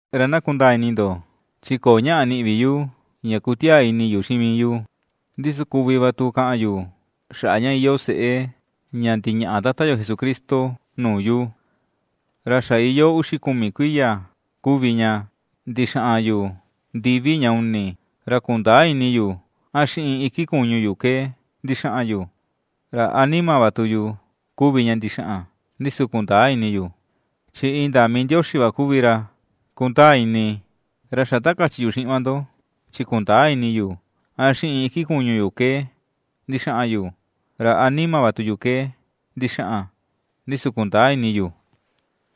Ra na kundaa ini ndo, chi köo ñaꞌa ^niꞌi vi yu, ña ^kutiaa ini yu xiꞌin mii yu. Ndi su kuvi va tu kaꞌan yu xaꞌa ña iyoo seꞌe ña ndiñaꞌa Tata yo Jesucristo nuu yu. Ra xa iyoo uxi kumi kuiya kuvi ña ndixaꞌan yu ndivi ña uni, ra kundäa ini yu a xiꞌin iki kuñu yu ke ndixaꞌan yu, ra a nima va tu yu kuvi ña ndixaꞌan, ndi su kundäa ini yu; chi indaa mii Ndioxi va kuvi ra kundaa ini. Ra xa ta kachi yu xiꞌin va ndo, chi kundäa ini yu a xiꞌin iki kuñu ke ndixaꞌan yu, ra a nima va tu yu ke ndixaꞌan, ndi su kundäa ini yu,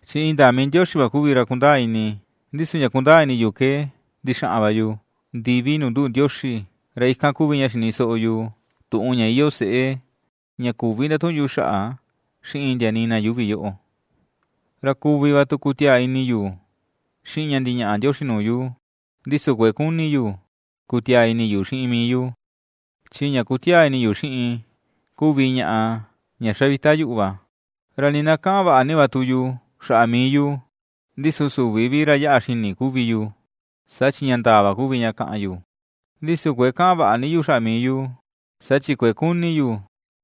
chi indaa mii Ndioxi va kuvi ra kundaa ini, ndi su ña kundaa ini yu ke ndixaꞌan va yu ndivi nuu nduꞌu Ndioxi, ra ikan kuvi ña xini soꞌo yu tuꞌun ña iyoo seꞌe ña küvi ndatuꞌun yu xaꞌa xiꞌin ndia nii na yuuvi yoꞌo. Ra kuvi va tu kutiaa ini yu xiꞌin ña ndiñaꞌa Ndioxi nuu yu, ndi su kuëe kuni yu kutiaa ini yu xiꞌin mii yu, chi ña ^kutiaa ini yu xiꞌin kuvi ñaꞌa ña xa vita yuꞌu va. Ra nii na kaꞌan vaꞌa ni va tu yu xaꞌa mii yu, ndi su süvi vi ra yaꞌa xini kuvi yu, saa chi ña ndaa va kuvi ña kaꞌan yu; ndi su kuëe kaꞌan vaꞌa ni yu xaꞌa mii yu, saa chi kuëe kuni yu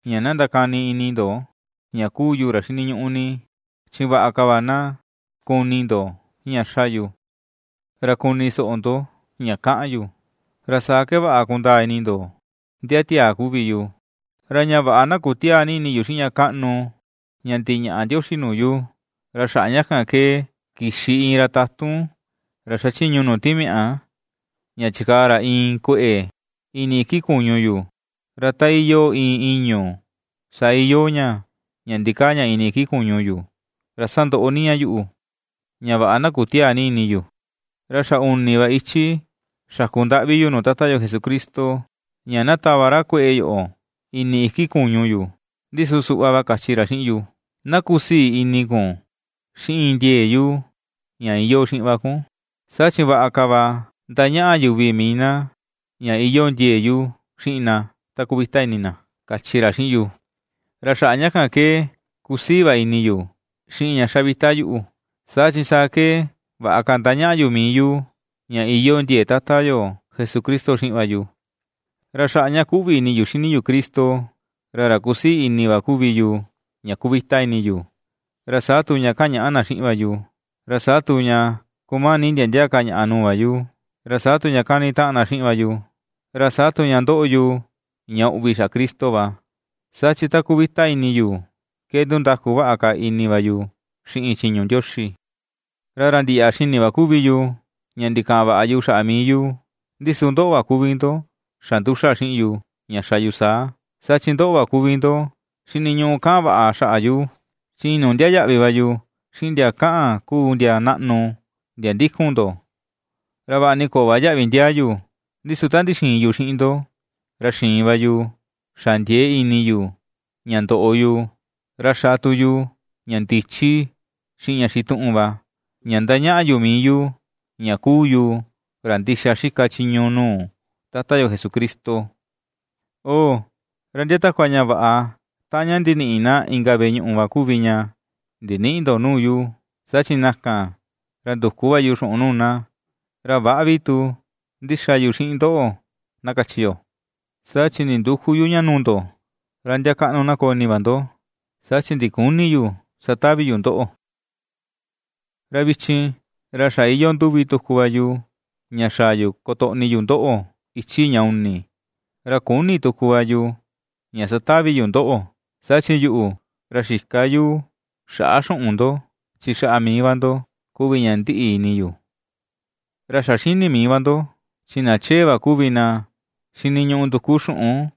ña na ndakani ini ndo ña kuu yu ra xiniñuꞌu ni. Chi vaꞌa ka va na kuni ndo ña ^xa yu, ra kuni soꞌo ndo ña ^kaꞌan yu, ra saa ke vaꞌa kundaa ini ndo ndia tiaa kuvi yu. Ra ña vaꞌa na kutiäa ni ini yu xiꞌin ña kaꞌnu ña ndiñaꞌa Ndioxi nuu yu, ra xaꞌa ña kan ke kixi iin ra tatun, ra xachiñu nuu timiaꞌa ña chikaa ra iin kueꞌe ini iki kuñu yu, ra ta iyoo iin ìñu̱ saa iyoo ña, ña ndikaa ña ini iki kuñu yu, ra sandoꞌo ni ña yuꞌu, ña vaꞌa na kutiäa ni ini yu. Ra xa uni va ichi xaku ndaꞌvi yu nuu Tata yo Jesucristo, ña na tava ra kueꞌe yoꞌo ini iki kuñu yu. Ndi su suꞌva va kachi ra xiꞌin yu: “Na kusii ini kun xiꞌin ndiee yu ña iyoo xiꞌin va kun; saa chi vaꞌa ka va ndañaꞌa yuvi mii na ña iyoo ndiee yu xiꞌin na, ta kuvita ini na”, kachi ra xiꞌin yu. Ra xaꞌa ña kan ke kusii va ini yu, xiꞌin ña xa vita yuꞌu, saa chi saa ke vaꞌa ka ^ndañaꞌa yu mii yu ña iyoo ndiee Tata yo Jesucristo xiꞌin va yu. Ra xaꞌa ña kuꞌvi ini yu xini yu Cristo, ra ra kusii ini va kuvi yu ña kuvita ini yu, ra saa tu ña ^kañaꞌa na xiꞌin va yu, ra saa tu ña ^kumani ndia ndia ka ñaꞌa nuu va yu, ra saa tu ña ^kanitaꞌan na xiꞌin va yu, ra saa tu ña ^ndoꞌo yu ña uꞌvi xaꞌa Cristo va. Saa chi ta kuvita ini yu, ke ndundaku vaꞌa ka ini va yu xiꞌin chiñu Ndioxi. Ra ra ndiyaꞌa xini va kuvi yu, ña ndikaꞌan vaꞌa yu xaꞌa mii yu, ndi su ndoꞌo va kuvi ndo xa nduxa xiꞌin yu, ña xa yu saa. Saa chi ndoꞌo va kuvi ndo xiniñuꞌu kaꞌan vaꞌa xaꞌa yu; chi inuu ndiaa yaꞌvi va yu, xiꞌin ndia kaꞌan kuu ndia naꞌnu, ndia ndikun ndo, ra vaꞌa ni köo va yaꞌvi ndiaa yu. Ndi su ta ndixiin yu xiꞌin ndo, ra xiin va yu xa ndiee ini yu ña ndoꞌo yu, ra xa tu yu ña ndichi, xiꞌin ña xituꞌun va ña ^ndañaꞌa yu mii yu ña kuu yu ra ndixa xika chiñu nuu Tata yo Jesucristo. ¡Oo, ra ndia takua ña vaꞌa taꞌan ña, ndiniꞌi na inka veꞌe ñuꞌu va kuvi ña ndinïꞌi ndo nuu yu, saa chi na kan, ra nduku va yu xuꞌun nuu na, ra väꞌa vi tu ndixa yu xiꞌin ndoꞌo na kachi yo, saa chi nindüku yu ña nuu ndo, ra ndia kaꞌnu na koo ini va ndo, saa chi ndiküni yu satavi yu ndoꞌo! Ra vichin, ra xa iyoo nduvi tuku va yu ña xaa yu kotoꞌni yu ndoꞌo, ichi ña uni, ra küni tuku va yu ña satavi yu ndoꞌo. Saa chi yuꞌu, ra xïka yu xaꞌa xuꞌun ndo, chi xaꞌa mii va ndo kuvi ña ndiꞌi ini yu. Ra xa xini mii va ndo, chi na chee va kuvi na xiniñuꞌu nduku xuꞌun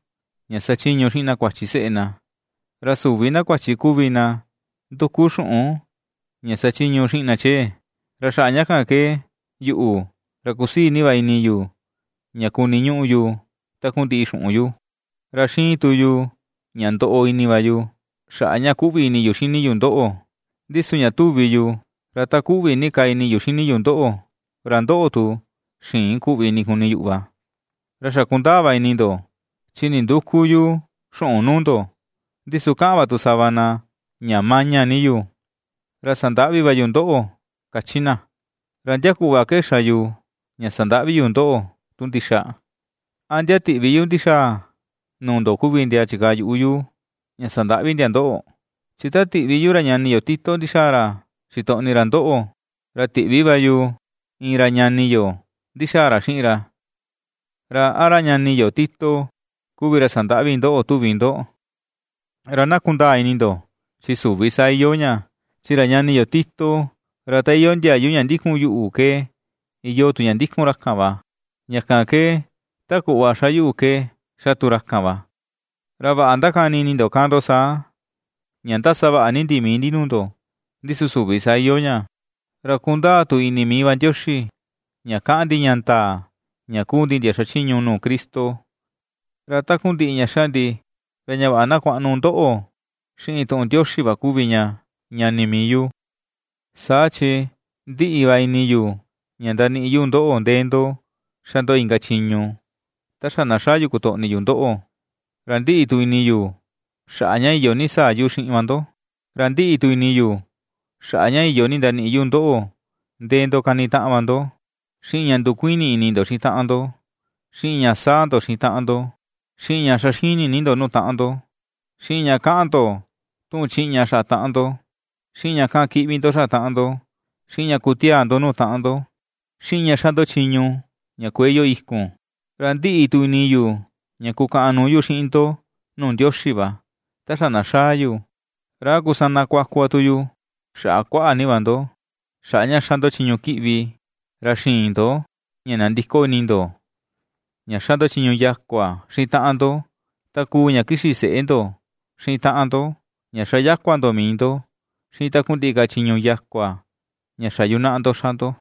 ña sachiñu xiꞌin na kuachi seꞌe na, ra süvi na kuachi kuvi na nduku xuꞌun ña sachiñu xiꞌin na chee. Ra xaꞌa ña kan ke yuꞌu, ra kusii ni va ini yu ña kuniñuꞌu yu takundiꞌi xuꞌun yu, ra xiin tu yu ña ndoꞌo ini va yu, xaꞌa ña kuꞌvi ini yu xini yu ndoꞌo; ndi su ña tuvi yu, ra ta kuꞌvi ni ka ini yu xini yu ndoꞌo, ra ndoꞌo tu, xïin kuꞌvi ini kuni yuꞌu va. Ra xa kundaa va ini ndo, chi nindüku yu xuꞌun nuu ndo. Ndi su ^kaꞌan va tu sava na ña maña ni yu, ra sandaꞌvi va yu ndoꞌo, kachi na. ¿Ra ndia kuꞌva ke xa yu ña sandaꞌvi yu ndoꞌo tu ndixa? ¿A ndia tiꞌvi yu ndixaa nuu ndo kuvi ndia chikaa yuꞌu yu, ña sandaꞌvi ndia ndoꞌo? Chi ta tiꞌvi yu ra ñani yo Tito ndixaa ra xitoꞌni ra ndoꞌo, ra tiꞌvi va yu iin ra ñani yo ndixaa ra xiꞌin ra. ¿Ra a ra ñani yo Tito kuvi ra sandaꞌvi ndoꞌo tuvi ndo? Ra na kundaa ini ndo, chi süvi saa iyoo ña, chi ra ñani yo Tito, ra ta iyoo ndiayu ña ndikun yuꞌu ke iyoo tu ña ndikun ra kan va, ña kan ke ta kuꞌva ^xa yuꞌu ke ^xa tu ra kan va. Ra vaꞌa ndakani ini ndo kaꞌan ndo saa, ña ^ndasavaꞌa ni ndi mii ndi nuu ndo. Ndi su süvi saa iyoo ña; ra kundaa tu ini mii va Ndioxi ña kaꞌan ndi ña ndaa ña kuu ndi ndia xachiñu nuu Cristo. Ra takundiꞌi ña ^xa ndi, ra ña vaꞌa na kuaꞌnu ndoꞌo xiꞌin tuꞌun Ndioxi va kuvi ña, ñani mii yu. Saa chi ndiꞌi va ini yu ña ndaniꞌi yu ndoꞌo ndee ndo ^xa ndo inka chiñu, ta xa na xaa yu kotoꞌni yu ndoꞌo, ra ndiꞌi tu ini yu, xaꞌa ña iyo ni sa̱a̱ yu xiꞌin va ndo. Ra ndiꞌi tu ini yu xaꞌa ña iyo ni ndaniꞌi yu ndoꞌo ndee ndo kanitaꞌan va ndo, xiꞌin ña ndukuini ini ndo xiꞌin taꞌan ndo, xiꞌin ña saa ndo xiꞌin taꞌan ndo, xiꞌin ña ^xa xini ni ndo nuu taꞌan ndo, xiꞌin ña kaꞌan ndo tuꞌun chiꞌña xaꞌa taꞌan ndo, xiꞌin ña kaꞌan kiꞌvi ndo xaꞌa taꞌan ndo, xiꞌin ña kutiaa ndo nuu taꞌan ndo, xiꞌin ña ^xa ndo chiñu ña kuëe iyoo ikun. Ra ndiꞌi tu ini yu ña kukaꞌan nuu yu xiꞌin ndo nuu Ndioxi va, ta xa na xaa yu, ra a kusana kuaku tu yu xaꞌa kuaꞌa ni va ndo, xaꞌa ña ^xa ndo chiñu kiꞌvi, ra xïin ndo ña nandiko ini ndo ña xa ndo chiñu yakua xiꞌin taꞌan ndo, ta kuu ña kixi seꞌe ndo xiꞌin taꞌan ndo ña xa yakua ndo mii ndo, xiꞌin takundiꞌi ka chiñu yakua, ña xa yunaꞌa ndo ^xa ndo.